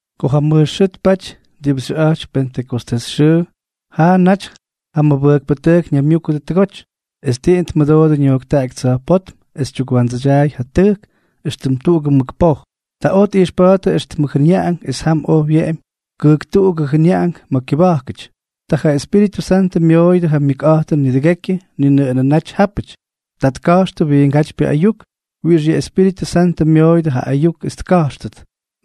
Ko ja mʉj xʉʉ tpaty diꞌibʉ xyʉꞌa̱jtypy Pentʉkostés xʉʉ, jaa naty ja mʉbʉjkpʉtʉjk ñaymyúkʉdʉ tʉgoty, es tiꞌin tmʉdoodʉ ñojktaꞌaky tsa̱jpótm es tyukwandsʉdyaay ja tʉjk éxtʉm tuꞌugʉ mʉk poj. Ta oj tꞌijxpa̱a̱ttʉ éxtʉmʉ jʉnyaꞌank, es jam oj wyeꞌemy kʉjktuꞌugʉ jʉnyaꞌank ma̱ kyʉba̱jkʉty. Ta ja Espíritʉ Santʉ myooyʉdʉ ja myʉkꞌa̱jtʉn nidʉgekyʉ ni nʉꞌʉnʉ naty jápʉty. Ta tka̱jxtʉ wiingátypyʉ ayuk wiꞌix yʉ Espíritʉ Santʉ myooyʉdʉ ja ayuk es tka̱jxtʉt.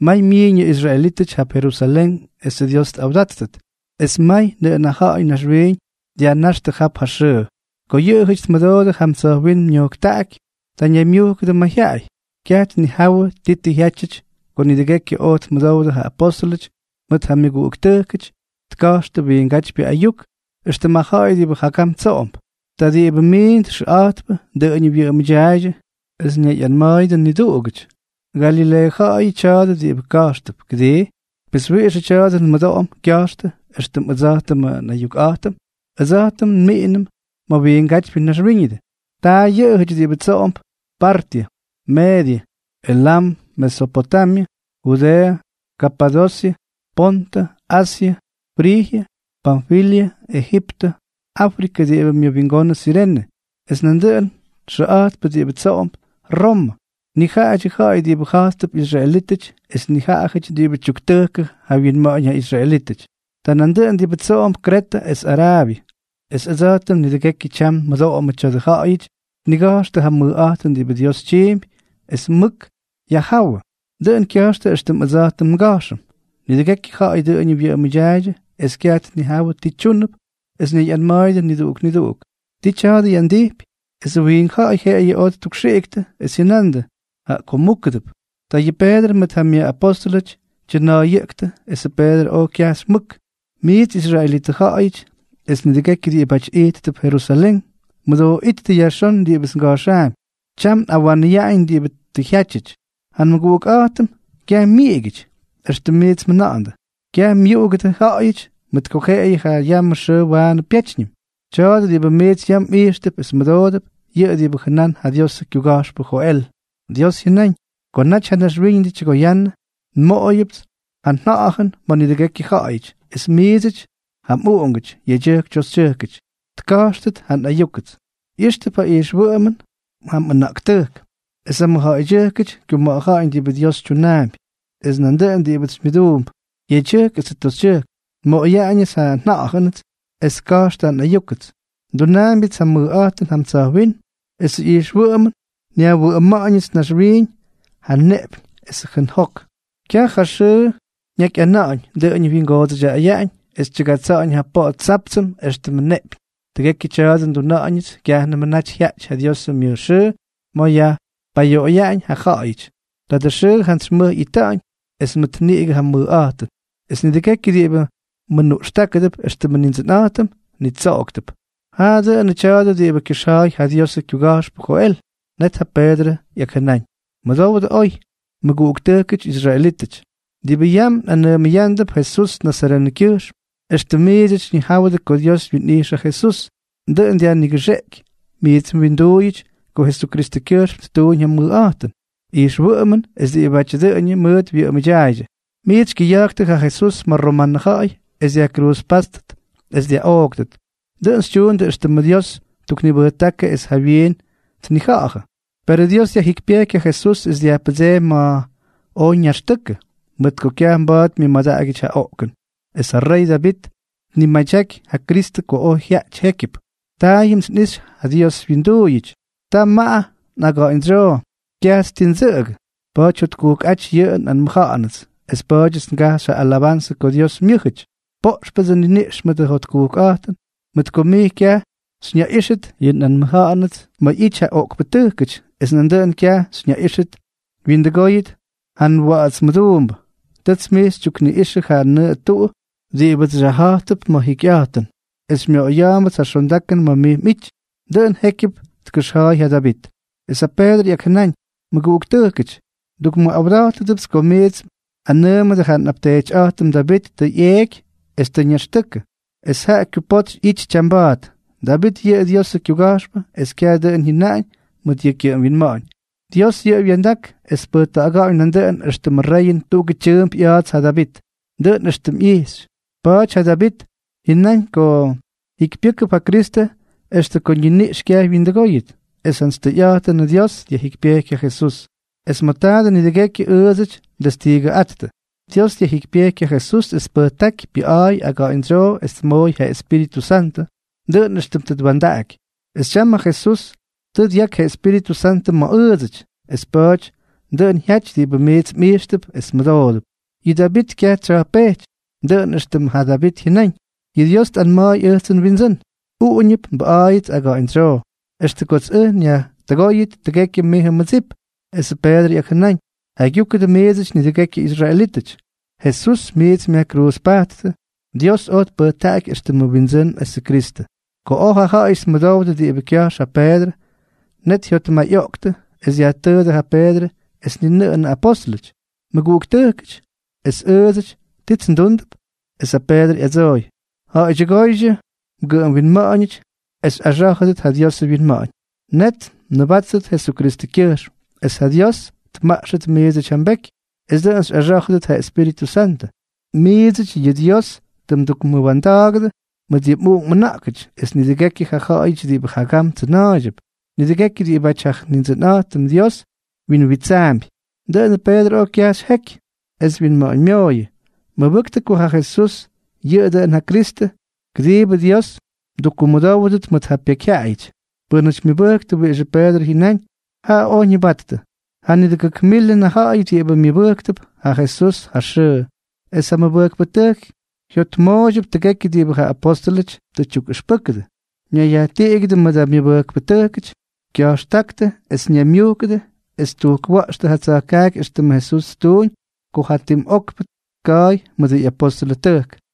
May myiiñ yʉ israelítʉty jap Jerusalén esʉ Dios tꞌawdáttʉt, es may nʉꞌʉn ja ja̱ꞌa̱y naxwiiñ dyajna̱jxtʉ jap ja xʉʉ. Ko yʉꞌʉjʉty tmʉdoodʉ jam tsa̱jwínm ñojktaꞌaky, ta ñaymyujkʉdʉ mayjyaꞌay. Kyaj tnijawʉ ti tʉ jyátyʉty ko nidʉgekyʉ oj tmʉdowdʉ ja apóstʉlʉty mʉt ja myʉguꞌuktʉjkʉty tka̱jxtʉ wiingátypyʉ ayuk éxtʉm ja ja̱ꞌa̱y diꞌibʉ jagam tsoꞌomp. Ta diꞌibʉ miindʉ xʉꞌa̱jtpʉ dʉꞌʉñʉ wyʉꞌʉmʉdyaaydyʉ, es ñayꞌanma̱a̱yʉdʉ niduꞌugáty: —Galileeʉ ja̱ꞌa̱yʉ tya̱a̱dʉ diꞌibʉ ka̱jxtʉp, ¿kʉdii? Pes, ¿wiꞌixʉ tya̱a̱dʉ nmʉdoꞌom kya̱jxtʉ éxtʉm ʉdsa̱jtʉmʉ nꞌayukꞌa̱jtʉm? ¡Ʉdsa̱jtʉm nmiꞌinʉm ma̱ wiingátypyʉ naxwíñʉdʉ! Ta yʉ ja̱ꞌa̱y diꞌibʉ tsoꞌomp Partyʉ, Meedyʉ, Elam, Mesopotamyʉ, Judeeʉ, Kapadosyʉ, Pontʉ, Asyʉ, Frijyʉ, Panfilyʉ, Ejiptʉ, Áfrikʉ diꞌibʉ myʉwingonʉ Sirene, es nandʉꞌʉnʉ xʉꞌa̱jtpʉ diꞌibʉ tsoꞌomp Romʉ. Nijaꞌadyʉ ja̱ꞌa̱y diꞌibʉ ja̱jtp israelítʉty es nijaꞌajʉty diꞌibʉ tyuktʉjkʉ ja wyinma̱ꞌa̱ñ ja israelítʉty. Ta nandʉꞌʉnʉ diꞌibʉ tsoꞌomp Kretʉ es Araabyʉ. ¡Es ʉdsa̱jtʉm nidʉgekyʉ tyam nmʉdoꞌomʉ tya̱dʉ ja̱ꞌa̱yʉty tniga̱jxtʉ ja mʉjꞌa̱jtʉn diꞌibʉ Dios tyiimpy es mʉk yajjáwʉ, dʉꞌʉn kya̱jxtʉ éxtʉm ʉdsa̱jtʉm nga̱jxʉm! Nidʉgekyʉ ja̱ꞌa̱y dʉꞌʉñʉ wyʉꞌʉmʉdyaaydyʉ es kyaj tnijawʉ ti tyúnʉp es ñayꞌanma̱a̱yʉdʉ niduꞌuk niduꞌuk: —¿Ti tya̱a̱dʉ ꞌyandijpy? Esʉ wiink ja̱ꞌa̱y jeꞌeyʉ oj ttukxiꞌiktʉ, es jyʉna̱ꞌa̱ndʉ: —Jaꞌa ko múkʉdʉp. Ta yʉ Peedrʉ mʉt ja myʉꞌapóstʉlʉty tyʉna̱a̱yʉꞌktʉ, esʉ Peedrʉ oj kyajxy mʉk: —Miits israelitʉ ja̱ꞌa̱yʉty es nidʉgekyʉ diꞌibáty ijttʉp Jerusalén, mʉdooꞌíttʉ yajxón diꞌibʉts nga̱jxaampy. Tyam nꞌawanʉyaꞌañ diꞌibʉ tʉ jyátyʉty. Ja nmʉguꞌukꞌa̱jtʉm kyaj myiꞌigyʉty, éxtʉm miits mjʉna̱ꞌa̱ndʉ. Kyaj myuꞌugʉdʉ ja̱ꞌa̱yʉty mʉt ko jeꞌeyʉ ja yamʉ xʉʉ waanʉ pyétyñʉm. Tya̱a̱dʉ diꞌibʉ miits yam mꞌijxtʉp es mmʉdoodʉp, yʉꞌʉ diꞌibʉ jʉnán ja Diosʉ kyuga̱jxpʉ Joel: Dios jyʉnáñ: “Ko naty ja naxwíñʉdʉ tyʉgoyannʉ, nmoꞌoyʉpts ja nJa̱ꞌa̱jʉn ma̱ nidʉgekyʉ ja̱ꞌa̱yʉty, es miidsʉty ja mꞌuꞌungʉty, yedyʉjk toxytyʉjkʉty, tka̱jxtʉt ja nꞌayúkʉts. ꞌYijxtʉp ja ijxma̱ꞌtʉn ja mꞌʉna̱ꞌktʉjk, es ja mmʉjja̱ꞌa̱ydyʉjkʉty kyuma̱ꞌa̱ja̱ꞌa̱ñ diꞌibʉ Dios tyunaampy. Es nandʉꞌʉn diꞌibʉts xymyʉduump, yedyʉjk esʉ toxytyʉjk, nmoꞌoyaꞌañʉts ja nJa̱ꞌa̱jʉnʉts, es tka̱jxʉdʉ nꞌayúkʉts. Ndunaambyʉts ja mʉjꞌa̱jtʉn jam tsa̱jwínm, esʉ ijxwʉꞌʉmʉn nyajwʉꞌʉma̱ꞌa̱ñʉts naxwiiñ, ja neꞌpyñ esʉ jʉʉn jok. Kyaj ja xʉʉ ñakyꞌana̱ꞌa̱ñ, dʉꞌʉñʉ wyingoodsʉyaꞌañ, es tyʉgatsa̱ꞌa̱ñ ja poꞌo tsáptsʉm éxtʉmʉ neꞌpyñ. Tʉgekyʉ tya̱a̱dʉ nduna̱ꞌa̱ñʉts kyajnʉmʉ naty jyaꞌty ja Diosʉ myʉj xʉʉ ma̱ yajpayoꞌoyaꞌañ ja ja̱ꞌa̱yʉty. Tadʉ xʉʉ jantsy mʉj ꞌyita̱ꞌa̱ñ es mʉt niꞌigʉ ja mʉjꞌa̱jtʉn. Es nidʉgekyʉ diꞌibʉ mʉnuꞌxtákʉdʉp éxtʉmʉ Nindsʉnꞌa̱jtʉm, nitsoꞌoktʉp.” Jaꞌa dʉꞌʉnʉ tya̱a̱dʉ diꞌibʉ kyʉxja̱a̱y ja Diosʉ kyuga̱jxpʉ Joel. Net ja Peedrʉ ꞌyakjʉnáñ: —Mʉdowdʉ oy, mʉguꞌuktʉjkʉty israelítʉty, diꞌibʉ yam nꞌanʉʉmʉyándʉp Jesús nazarenʉkyʉjxm. Extʉm miits xyñijáwʉdʉ ko Dios twinꞌijxy ja Jesús, dʉꞌʉn dyajnigʉxeꞌky miits mwinduuyʉty ko Jesuskyʉjxm ttuuñ ja mʉjꞌa̱jtʉn, ijxwʉꞌʉmʉn es diꞌibʉ ja̱ꞌa̱y dʉꞌʉñʉ mʉʉt wyʉꞌʉmʉdyaꞌaydyʉ. Miits xykyʉya̱jktʉ ja Jesús ma̱ ja romanʉ ja̱ꞌa̱y es dyajkruuzpáttʉt es dyaꞌooktʉt. Dʉꞌʉn xytyuundʉ éxtʉmʉ Dios ttuknibʉjtákʉ es jawyiin tnija̱ꞌa̱jʉ. Perʉ Dios dyajjikypyejky ja Jesús es dyajpʉdseemy ma̱ oj ñaxtʉkʉ, mʉt ko kyaj mba̱a̱t myʉmadaꞌagyʉty ja oꞌkʉn. Es ja rey Davit tnimadyaky ja Kristʉ ko oj jyaꞌay jékyʉp: Taayʉmts nꞌixy ja Dios nwinduuyʉts. Tamaꞌa nꞌaga̱ꞌa̱ñdsyoo, kyajts tii ndsʉꞌʉgʉ. Pa̱a̱ty jyotkujkꞌáty yʉ nꞌanmʉja̱ꞌa̱nʉts, es pa̱a̱dyʉts ngajxy ja alabanzʉ ko Dios myʉ́jʉty. Poꞌxʉptsʉ nniniꞌx mʉt ja jotkujkꞌa̱jtʉn, mʉt ko mij kyaj xyñaꞌíxʉt yʉ nꞌanmʉja̱ꞌa̱nʉts ma̱ ꞌyity ja oꞌkpʉtʉjkʉty, es nan kyaj xyñaꞌíxʉt wyindʉgóyʉt ja mWa̱ꞌa̱ts Mʉduumbʉ. Tʉts mij xytyukniꞌꞌixʉ ja nʉꞌʉ tuꞌu diꞌibʉts xyajja̱ꞌtʉp ma̱ ja jikyꞌa̱jtʉn, es xymyoꞌoya̱a̱mbʉts ja xondakʉn ma̱ mij mꞌity. Dʉꞌʉn jékyʉp tkʉxja̱a̱y yʉ Davit. Es ja Peedrʉ ꞌyakjʉnáñ: —Mʉguꞌuktʉjkʉty, ndukmʉꞌawda̱jtʉbʉts ko miits nꞌanʉʉmʉdʉ ja nꞌapteetyꞌa̱jtʉm Davit tʉ ꞌyeeky es tʉ ñaxtʉkʉ, es tam ja kyupotsy ꞌyity tyamba̱a̱t. Davit yʉꞌʉ Diosʉ kyuga̱jxpʉ, es kyaj dʉꞌʉn jyʉnáñ mʉt yʉ kyʉꞌʉm winma̱ꞌa̱ñ, Dios yʉꞌʉ wya̱ndak es tpʉjta̱ꞌa̱ga̱ꞌa̱ñ nandʉꞌʉn éxtʉmʉ reyʉn tuꞌugʉ tyʉʉmp ꞌya̱a̱ts ja Davit. Dʉꞌʉn éxtʉm ꞌyixy, pa̱a̱ty ja Davit jyʉnáñ ko jikypyʉ́kʉp ja Kristʉ es ko yʉ ñiniꞌx kyaj wyindʉgóyʉt. Es jantsy tʉyꞌa̱jtʉnʉ Dios dyajjikypyejky ja Jesús, es ma̱ taadʉ nidʉgekyʉ ʉʉdsʉty ndestiigʉꞌáttʉ. Dios dyajjikypyejky ja Jesús es tpʉjtáky pyʉꞌa̱a̱y aga̱ꞌa̱ñdsyoo es tmooy ja Espíritʉ Santʉ, dʉꞌʉn éxtʉm tʉ twa̱ndaꞌaky. Es tyam ja Jesús tʉ dyaky ja Espíritʉ Santʉ ma̱ ʉʉdsʉty. Es pa̱a̱ty dʉꞌʉn jyaty diꞌibʉ miits mꞌijxtʉp es mmʉdoodʉp. Yʉ Davit kyaj tsya̱jpejty, dʉꞌʉn éxtʉm ja Davit jyʉnáñ: Yʉ Dios tꞌanma̱a̱y ʉjtsʉ nWindsʉ́n: “Uꞌuñʉp nbʉꞌa̱a̱yʉts aga̱ꞌa̱ñdsyoo extʉ kots ʉj nyajtʉgóyʉt tʉgekyʉ mijʉ mmʉdsip.” Esʉ Peedrʉ ꞌyakjʉnáñ: Jaygyúkʉdʉ miidsʉty nidʉgekyʉ israelítʉty. Jesús diꞌibʉ miits myajkruuzpajttʉ, Dios oj tpʉjtaꞌaky éxtʉmʉ Windsʉ́n esʉ Kristʉ. Ko oj ja ja̱ꞌa̱yʉty tmʉdowdʉ diꞌibʉ kya̱jx ja Peedrʉ, net jyotmayꞌoꞌktʉ es dyajtʉʉdʉ ja Peedrʉ es ni nʉꞌʉnʉ apóstʉlʉty: —Mʉguꞌuktʉjkʉty, es ʉʉdsʉty, ¿tits ndúndʉp? Esʉ Peedrʉ ꞌyadsooy: —Ja̱ꞌa̱ydyʉgóydyʉ mgʉꞌʉm winma̱ꞌa̱ñʉty es xyꞌaxá̱jʉdʉt ja Diosʉ wyinma̱ꞌa̱ñ. Net mnʉbáttʉt Jesukristʉ xyʉgyʉjxm, es ja Dios tmaꞌxʉt miidsʉty ja mbeky, es dʉꞌʉn xyꞌaxá̱jʉdʉt ja Espíritʉ Santʉ. Miidsʉty yʉ Dios tʉ mdukmʉwa̱nda̱a̱gʉdʉ mʉt yʉ mꞌuꞌunk mꞌʉna̱ꞌkʉty, es nidʉgekyʉ ja ja̱ꞌa̱yʉty diꞌibʉ jagam tsʉna̱a̱ydyʉp; nidʉgekyʉ diꞌibáty ja Nindsʉnꞌa̱jtʉm Dios wyinwitsaampy. Dʉꞌʉnʉ Peedrʉ oj kyajxy jeky, es wyinma̱ꞌa̱ñmyooyʉ: —Mʉbʉktʉ ko ja Jesús yʉꞌʉ dʉꞌʉn ja Kristʉ, kʉdiibʉ Dios mdukkumʉdówʉdʉt mʉt ja pekyjyaꞌayʉty. Pʉ́nʉty myʉbʉjktʉ wiꞌixʉ Peedrʉ jyʉnáñ, jaꞌa oj ñʉbattʉ. Janitʉgʉk milʉn ja ja̱ꞌa̱y diꞌibʉ myʉbʉjktʉp ja Jesús ja xʉʉ. Es ja mʉbʉjkpʉtʉjk jyotmooydyʉp tʉgekyʉ diꞌibʉ ja apóstʉlʉty tukꞌʉxpʉjkʉdʉp, ñayyajtiꞌigyʉdʉ mʉdʉ myʉmʉbʉjkpʉty, kya̱jxtáktʉ es ñaymyujkʉdʉ, es ttujkwa̱ꞌxtʉ ja tsa̱jkaaky éxtʉmʉ Jesús ttuuñ ko jatim okpʉ tka̱a̱y mʉdʉ ꞌyʉxpʉjkpʉtʉjk.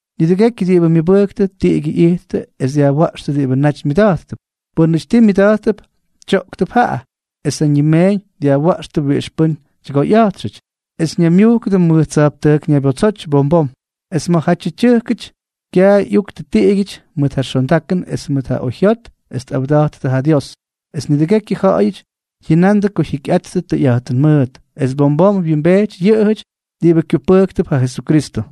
Nidʉgekyʉ diꞌibʉ myʉbʉjktʉ tiꞌigyʉ ꞌyittʉ es dyajwa̱ꞌxtʉ diꞌibʉ naty myʉda̱jttʉp. Pʉ́nʉty ti myʉda̱jttʉp, tyoꞌktʉp jaꞌa, es ja ñimeeñ dyajwa̱ꞌxtʉ wiꞌix pʉ́n tyʉgoyꞌa̱jtxʉty, es ñaymyujkʉdʉ mʉj tsa̱jptʉjk ñabotsoty bom bom. Es ma̱jatyʉ tyʉjkʉty kyaay ꞌyuktʉ tiꞌigyʉty mʉt ja xondakʉn es mʉt ja oyjyot es tꞌawda̱jttʉ ja Dios. Es nidʉgekyʉ ja̱ꞌa̱yʉty jyʉnandʉ ko jyikyꞌattʉ tʉyꞌa̱jtʉn mʉʉt. Es bom bom wyimbejty yʉꞌʉjʉty diꞌibʉ kyupʉjktʉp ja Jesukristʉ.